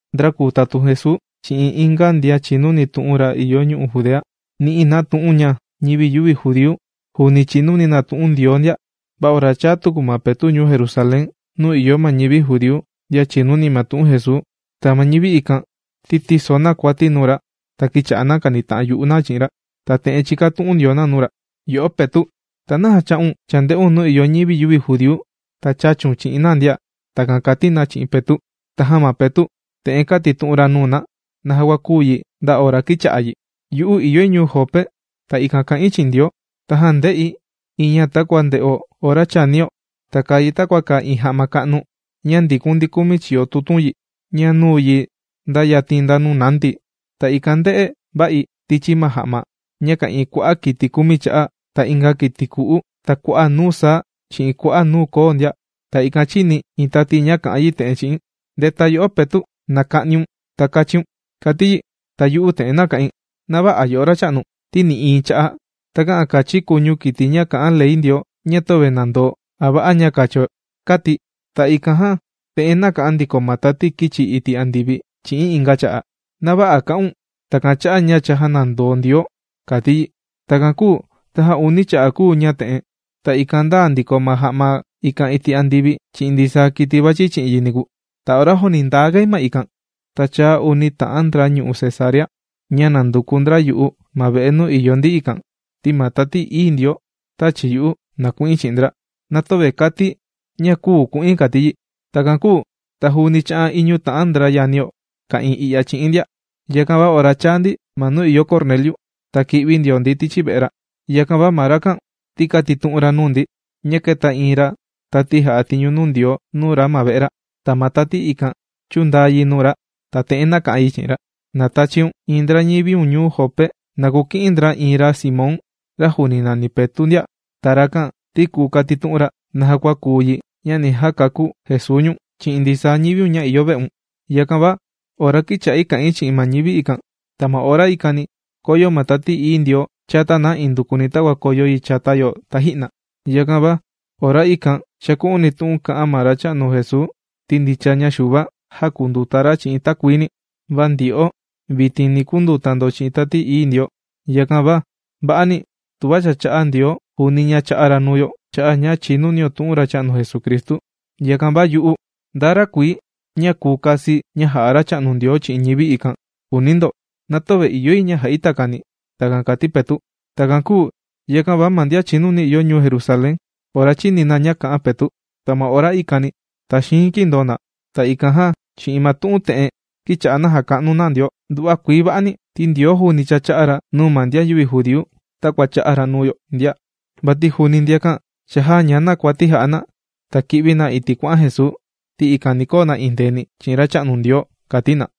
Ndra kùu tatun Jesuu chi'in inga ndian chìnuni tu'un ra ìyo ñu'u' Judea, nī'i na tu'un ña ñivi yüvi judíu juuni chìnuni na tu'un Ndioo ndia. Va ora chāa tuku ma Petu' ñuu Jerusalén nuu ìyo ma ñivi judíu ndian chìnuni ma tu'un Jesuu, ta ma ñivi ikan ti tīso na kuati nuu ra ta kīcha'a na kànita'an yu'u na chi'in ra. Ta te'en chìkatu'un ndio na nuu ra: ―Yo'o Petu', ¿ta naja chā'un chānde'un nuu ìyo ñivi yüvi judíu ta chāchiun chi'in na ndia? ―Takan kàti na chi'in Petu'. Tajan ma Petu' te'en kātitu'un ra nuu na naja kua kūu yi nda ora kīcha'a yi: ―Yu'u ìyoi ñuu Jope, ta ikan kà'in chi'in Ndioo. Tajan ndē'i iin ña takua ndè'o ora chànio. Ta kàa yi takua kàa iin ja'ma ka'nu ña ndìkun ndi kumi chiyo tutun yi, ña nūu yi nda yatin nda nuu nāndi̱. Ta ikan ndē'e va'i tichi ma ja'ma ña ka'ìin kua'a' kiti kumi cha'a, ta inga kiti ku'u, ta kua'a' nuu saa chi'in kua'a' nuu koo ndia. Ta ikan chīni̱ iin tati ña kà'an yi te'en chi'i̱n: “¡Ndeta yo'o Petu', na ka'niun ta kachiun!”, kàti yi. Ta yu'u te'en nāka'in: “Na vä'a yo'o Racha'nu, ti nï'iin cha'a' takä'an kachi̱ kuñu kiti ña kà'an ley Ndioo ña töve nàndoo a va'a ña kacho”, kāti̱. Ta ikan jan te'en nāka'an ndiko ma tati kīchi iti' andivi chi'i̱n inga cha'a': “Na vä'a kà'un takan cha'a' ña cha jānandoo Ndioo”, kàti yi. Takan kūu tajan uni cha'a' kūu ña'a te'en, ta ikan ndāa ndiko ma ja'ma ikan iti' andivi chi'in ndisaa kiti vàchi chi'in yi niku. Ta ora juuni ndāa ga yi ma ikan, ta chāa uni ta'an ndra ñuu Cesarea, ña nànduku ndra yu'u ma ve'e nuu ìyo ndi ikan. Ti ma Tati Ií Ndioo tāchi yu'u, na ku'in chi'in ndra, na töve kàti̱ ña küu ku'in kàti yi. Takan kūu ta juuni chā'an iñu ta'an ndra yanio ka'ìin i'ya chi'i̱n ndia. Yakan va ora chāa ndi ma nuu ìyo Corneliu, ta kī'vi ndio ndi tichi ve'e ra. Yakan va ma rakan ti kātitu'un ra nuu ndi ña kēta iin tati jà'a tiñu nuu Ndioo nuu ra ma ve'e ra. Ta ma tati ikan chūndaa yi nuu ra ta te'en nāka'an yi chi'in ra: “Na tachiun iin ndra ñiviun ñuu Jope, na kuki'in ndra iin ra Simón ra juuni nàni Petu' ndia. Ta rakan ti kùu katitu'un ra naja kua kùu yi ña ni jakakú Jesuu ñu̱n chi'in ndisaa ñiviun ña ìyo ve'un.” Yakan va ora kīcha'i kà'in chi'in ma ñivi ikan, ta ma ora ikani kōyo ma Tati Ií Ndioo chata na indukuni takua kōyo yi chata yo taji'na. Yakan va ora ikan chāku'uni̱ tu'un kā'an ma Racha'nu Jesuu ti ndicha ña Xuva, jākunduta ra chi'in takuini, va ndyo'o vitin ni kunduta ndo chi'in Tati Ií Ndioo. Yakan va va'ani, tuva cha chā'a Ndioo juuni ña chā'a ra nuu yo, nuu ma ñivi ikan, cha'a' ña chìnunio tu'un Racha'nu Jesucristu. Yakan va yu'u, ¿nda ra kùi ña kùu kasi̱ ña jà'a Racha'nu Ndioo chi'in ñivi ikan?, kùuni ndo. ¡Na töve ìyo yi ña ja'i takani! ―Takan kàti Petu'. Takan kūu yakan va ma ndian chìnuni ìyo ñuu Jerusalén ora chīni na ña kā'an Petu', ta ma ora ikani taxiin kīndoo na. Ta ikan jan chi'in ma tu'un te'en kīcha'a na jàka'nu na Ndioo: ―Nduva'a kuii va'ani ti Ndioo juuni cha chā'a ra nuu ma ndian yüvi judíu takua chā'a ra nuu yo ndia. Vati juuni ndiakan cha jāña na ma kuati jà'a na ta kī'vi na iti' kuà'an Jesuu, ti ikan ni koo na endeeni chi'in Racha'nu Ndioo ―kàti na.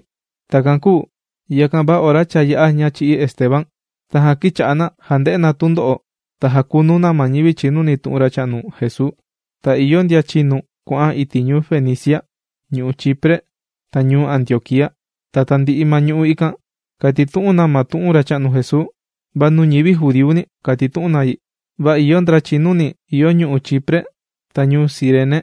Takan kūu yakan va ora cha yā'a ña chī'í ma Esteban, tajan kīcha'a na jànde'e na tundo'o ta jàkunu na ma ñivi chìnuni tu'un Racha'nu Jesuu. Ta ìyo ndian chīnu kuà'an iti' ñu'u' Fenicia, ñu'u' Chipre, ta ñuu Antioquía. Ta tandi'i ma ñu'u' ikan kàtitu'un na ma tu'un Racha'nu Jesuu, va nuu ñivi judíuni, kàtitu'un na yi. Va ìyo ndra chìnuni ìyo ñu'u' Chipre ta ñuu Cirene,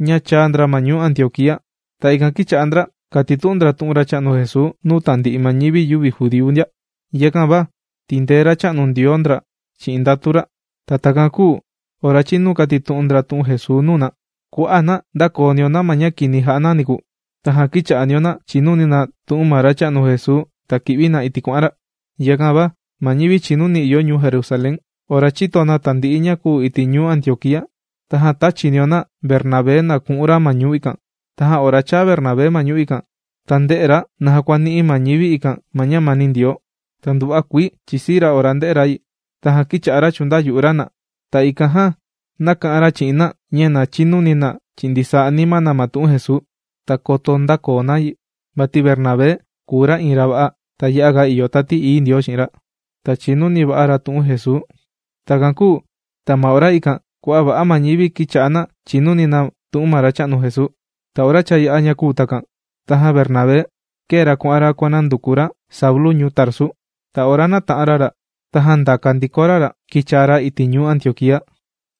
ña chāa ndra ma ñuu Antioquía. Ta ikan kīcha'a ndra kàtitu'un ndra tu'un Racha'nu Jesuu nuu tandi'i ma ñivi yüvi judíu ndia. Yakan va tìndee Racha'nu Ndioo ndra chi'in ndatu ra. Ta takan kūu ora chīnu kàtitu'un ndra tu'un Jesuu nuu na, kua'a' na ndākoo ndio na ma ña kini jà'a na niku. Tajan kīcha'a ndio na chìnuni na tu'un ma Racha'nu Jesuu ta kì'vi na iti' kuà'an ra. Yakan va ma ñivi chìnuni ìyo ñuu Jerusalén, ora chìto na tandi'i ña kūu iti' ñuu Antioquía, tajan tāchi ndio na Bernabé na ku'un ra ma ñuu ikan. Tajan ora chāa Bernabé ma ñuu ikan, ta ndē'e ra naja kua nī'i ma ñivi ikan ma ñamani Ndioo, ta nduva'a kuii chìsii ra ora ndē'e ra yi. Tajan kīcha'a ra chùndayu'u ra na, ta ikan jan nāka'an ra chi'in na ña na chinuni na chi'in ndisaa anima na ma tu'un Jesuu, ta koto ndäkoo na yi. Vati Bernabé kùu ra iin ra va'a, ta ya'a ìyo Tati Ií Ndioo chi'in ra, ta chìnuni va'a ra tu'un Jesuu. Takan kūu ta ma ora ikan kua'a' va'a ma ñivi kīcha'a na chìnuni na tu'un ma Racha'nu Jesuu. Ta ora cha yā'a ña kūu takan, tajan Bernabé kēe ra kuà'an ra kuànanduku ra Saulu ñuu Tarsu. Ta ora nāta'an ra ra, tajan ndāka ndiko ra ra kīchaa ra iti' ñuu Antioquía.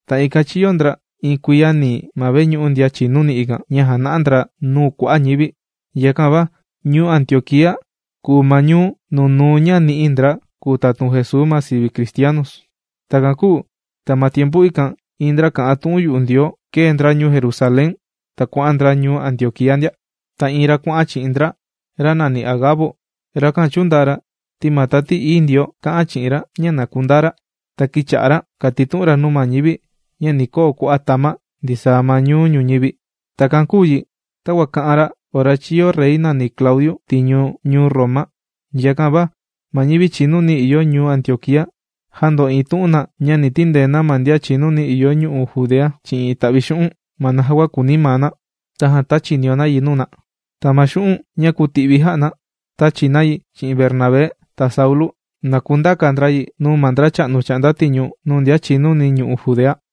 Ta ikan chīyo ndra iin kuiya nii ma veñu'u ndian chìnuni ikan, ña jàna'a ndra nuu kua'a' ñivi. Yakan va ñuu Antioquía kùu ma ñuu nunuu ña nī'i ndra kùu tatun Jesuu ma sivi: cristianos. Takan kūu ta ma tiempu ikan iin ndra kà'an tu'un yu'u Ndioo, kēe ndra ñuu Jerusalén ta kuà'an ndra ñuu Antioquía ndia. Ta iin ra kuà'an chi'in ndra, ra nàni Agabo. Rakan chūndaa ra ti ma Tati Ií Ndioo kā'an chi'in ra ña na kundaa ra, ta kīcha'a ra kàtitu'un ra nuu ma ñivi ña ni koo kua'a' tama' ndisaa ñuu ñuñivi. Takan kūu yi takua kā'an ra ora chīyo rey nàni Claudiu tiñu ñuu Roma. Yakan va ma ñivi chìnuni ìyo ñuu Antioquía, jāndo'iin tu'un na ña ni tindee na ma ndian chìnuni ìyo ñu'u' Judea chi'in ita'vi xu'un', ma naja kua kùuni maa na, tajan tāchi ndio na yi nuu na. Ta ma xu'un' ña kūti'vi jā'a na, tāchi na yi chi'in Bernabé ta Saulu na kundaka ndra yi nuu ma ndracha'nu chà'nda tiñu nuu ndian chìnuni ñu'u' Judea.